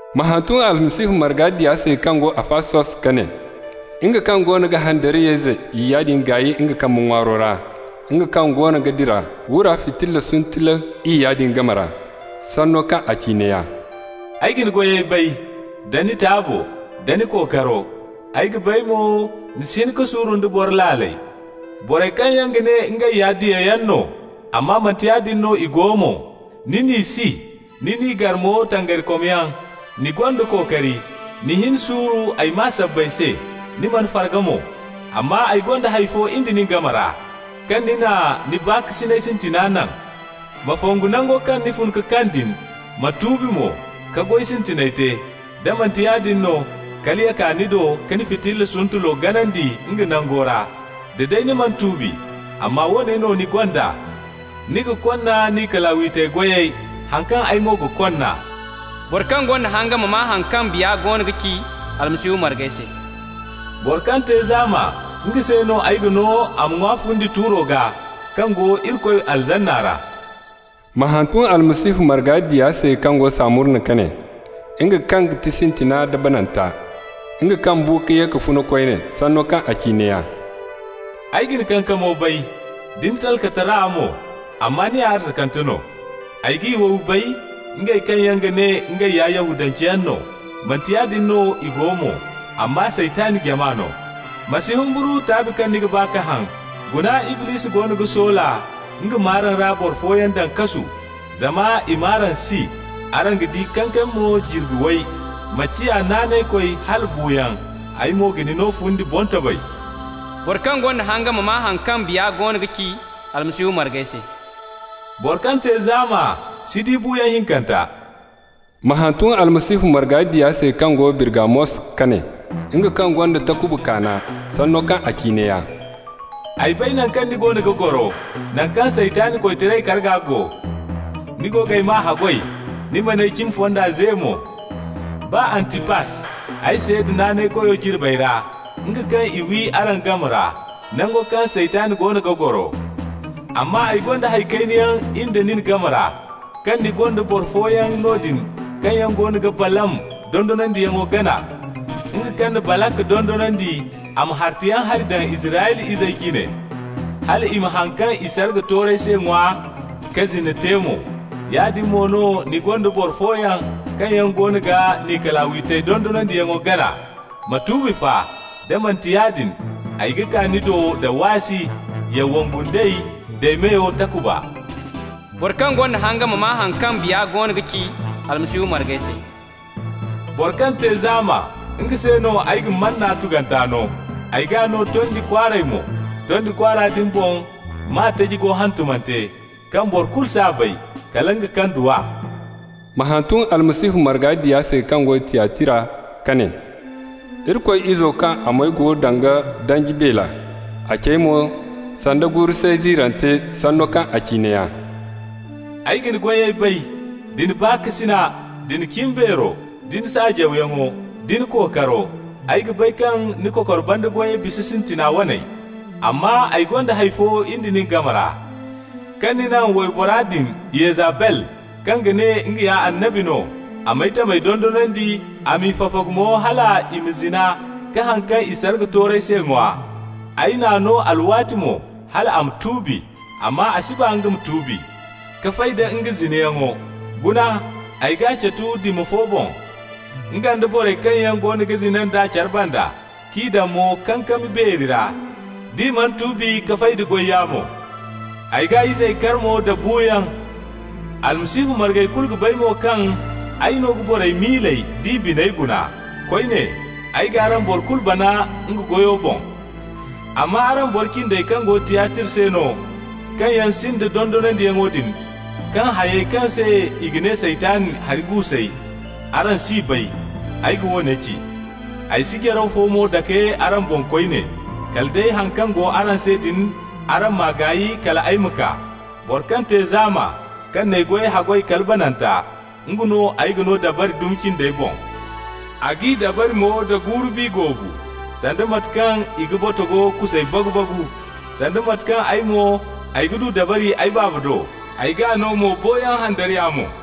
Ma hantum Almasihu marga diya se kaŋ go Afasos ka ne: «Nga kaŋ goono ga handariyayze iyya din gaay nga kambe ŋwaaro ra, nga kaŋ goono ga dira wura fitilla suntulu iyya din game ra, sanno kaŋ a ci neeya: Ay ga ni goyey bay, da ni taabo, da ni kookaro. Ay ga bay mo ni si hin ka suuru nda boro laaley. Borey kaŋ yaŋ ga ne ngey ya diyayaŋ no, amma manti yaadin no i go mo, ni n'i si, ni n'i gar mo tangarikomyaŋ. Ni gonda kookari, ni hin suuru ay maa sabbay se, ni mana farga mo. Amma ay gonda hay fo in da nin game ra: kaŋ ni na ni baakasinay sintina naŋ. Ma fongu nango kaŋ ni fun ka kaŋ din, ma tuubi mo, ka goy sintiney te. Da manti yaadin no, kala ya kaa ni do ka ni fitilla suntulo ganandi nga nango ra, da day ni mana tuubi. Amma woone no ni gonda: Ni ga konna Nikalawitey goyey, haŋ kaŋ ay mo ga konna. Boro kaŋ gonda hanga ma maa haŋ kaŋ Biya goono ga ci Almasihu margey se. Boro kaŋ te zaama, nga se no ay ga no a ma ŋwa fundi tuuro gaa, kaŋ go Irikoy Paradiso ra.» Ma hantum Almasihu marga diya se kaŋ go Samurna ka ne: «Nga kaŋ ga ti Sintina nda Bananta, nga kaŋ bu ka ye ka funa koyne, sanno kaŋ a ci neeya: Ay ga ni kankamo bay, da ni talkatara mo (amma ni ya arzakante no). Ay g'i wowi bay, ngey kaŋ yaŋ ga ne ngey ya Yahudanceyaŋ no, manti yaadin no i go mo, amma Saytan jama no. Ma si humburu taabi kaŋ ni ga ba ka haŋ. Guna Iblisi goono ga soola nga m'araŋ ra boro fooyaŋ daŋ kasu, zama i m'araŋ si. Araŋ ga di kankami mo jirbi way. Ma ciya naanaykoy hala buuyaŋ, ay mo ga ni no fundi boŋtobay. Boro kaŋ gonda hanga ma maa haŋ kaŋ Biya goono ga ci Almasihu margey se. Boro kaŋ te zaama si di buuyaŋ hinkanta.» Ma hantum Almasihu marga diya se kaŋ go Birgamos ka ne: «Nga kaŋ gonda takuba kaana, sanno kaŋ a ci neeya: Ay bay naŋ kaŋ ni goono ga goro, naŋ kaŋ Saytan koytaray karga go. Ni go g'ay maa haggoy, ni man'ay cimi fonda ze mo, baa Antipas, ay seeda naanaykoyo jirbey ra, nga kaŋ i wi araŋ game ra, nango kaŋ Saytan goono ga goro. Amma ay gonda hay kayna yaŋ in da nin game ra: kaŋ ni gonda boro fooyaŋ noodin kaŋ yaŋ goono ga Balaam dondonandiyaŋo gana, nga kaŋ na Balak dondonandi a ma hartayaŋ hari daŋ Israyla izey jine, hal i ma haŋ kaŋ i sarga toorey se ŋwa ka zina te mo. Yaadin mo no ni gonda boro fooyaŋ kaŋ yaŋ goono ga Nikalawitey dondonandiyaŋo gana. Ma tuubi fa! Da manti yaadin, ay ga kaa ni do da waasi, ya wongu nd'ey d'ay meyo takuba. Boro kaŋ gonda hanga ma maa haŋ kaŋ Biya goono ga ci Almasihu margey se. Boro kaŋ te zaama, nga se no ay ga Manna tuganta no, ay g'a no tondi kwaaray mo. Tondi kwaara din boŋ, maa taji go hantumante, kaŋ boro kulu s'a bay, kala nga kaŋ du a.» Ma hantum Almasihu marga diya se kaŋ go Tiyatira ka ne: «Irikoy Izo kaŋ a moy go danga danji beele, a cey mo, sanda guuru-say ziirante, sanno kaŋ a ci neeya: Ay ga ni goyey bay, da ni baakasina, da ni cimbeero, nda ni saajawyaŋo, da ni kookaro. Ay ga bay kaŋ ni kokor banda goyey bisa sintina waney. Amma ay gonda hay fo in da nin game ra: kaŋ ni naŋ waybora din Yezabel, kaŋ ga ne nga ya annabi no, a m'ay tamey dondonandi, a m'i fafagu mo hal i ma zina ka haŋ kaŋ i sarga toorey se ŋwa. Ay n'a no alwaati mo hal a ma tuubi, amma a si ba nga ma tuubi ka fay da nga zinayaŋo. Guna, ay g'a catu dima fo boŋ, nga nda borey kaŋ yaŋ goono ga zina nd'a care banda, k'i daŋ mo kankami beeri ra, d'i mana tuubi ka fay d'a goy yaamo. Ay g'a izey kar mo da buuyaŋ. Almasihu margey kulu ga bay mo kaŋ ay no ga borey miiley d'i biney guna. Koyne, ay g'araŋ boro kulu bana nga goyo boŋ. Amma araŋ boro cindey kaŋ go Tiyatira se no, kaŋ yaŋ sinda dondonandiyaŋo din, kaŋ hayey kaŋ se i ga ne ‹Saytan hari guusey›, araŋ s'i bay, ay ga woone ci: ay si jaraw fo mo dake araŋ boŋ koyne, kala day haŋ kaŋ go araŋ se din araŋ m'a gaay kal ay ma kaa. Boro kaŋ te zaama, kaŋ n'ay goyey haggoy kala bananta, nga no ay ga no dabari dumi cindey boŋ. ‹A g'i dabari mo da guuru-bi goobu, sanda mate kaŋ i ga botogo kusey bagu-bagu,› sanda mate kaŋ ay mo, ay du dabari ay Baaba do. Ay g'a no mo boyaŋ handariya mo.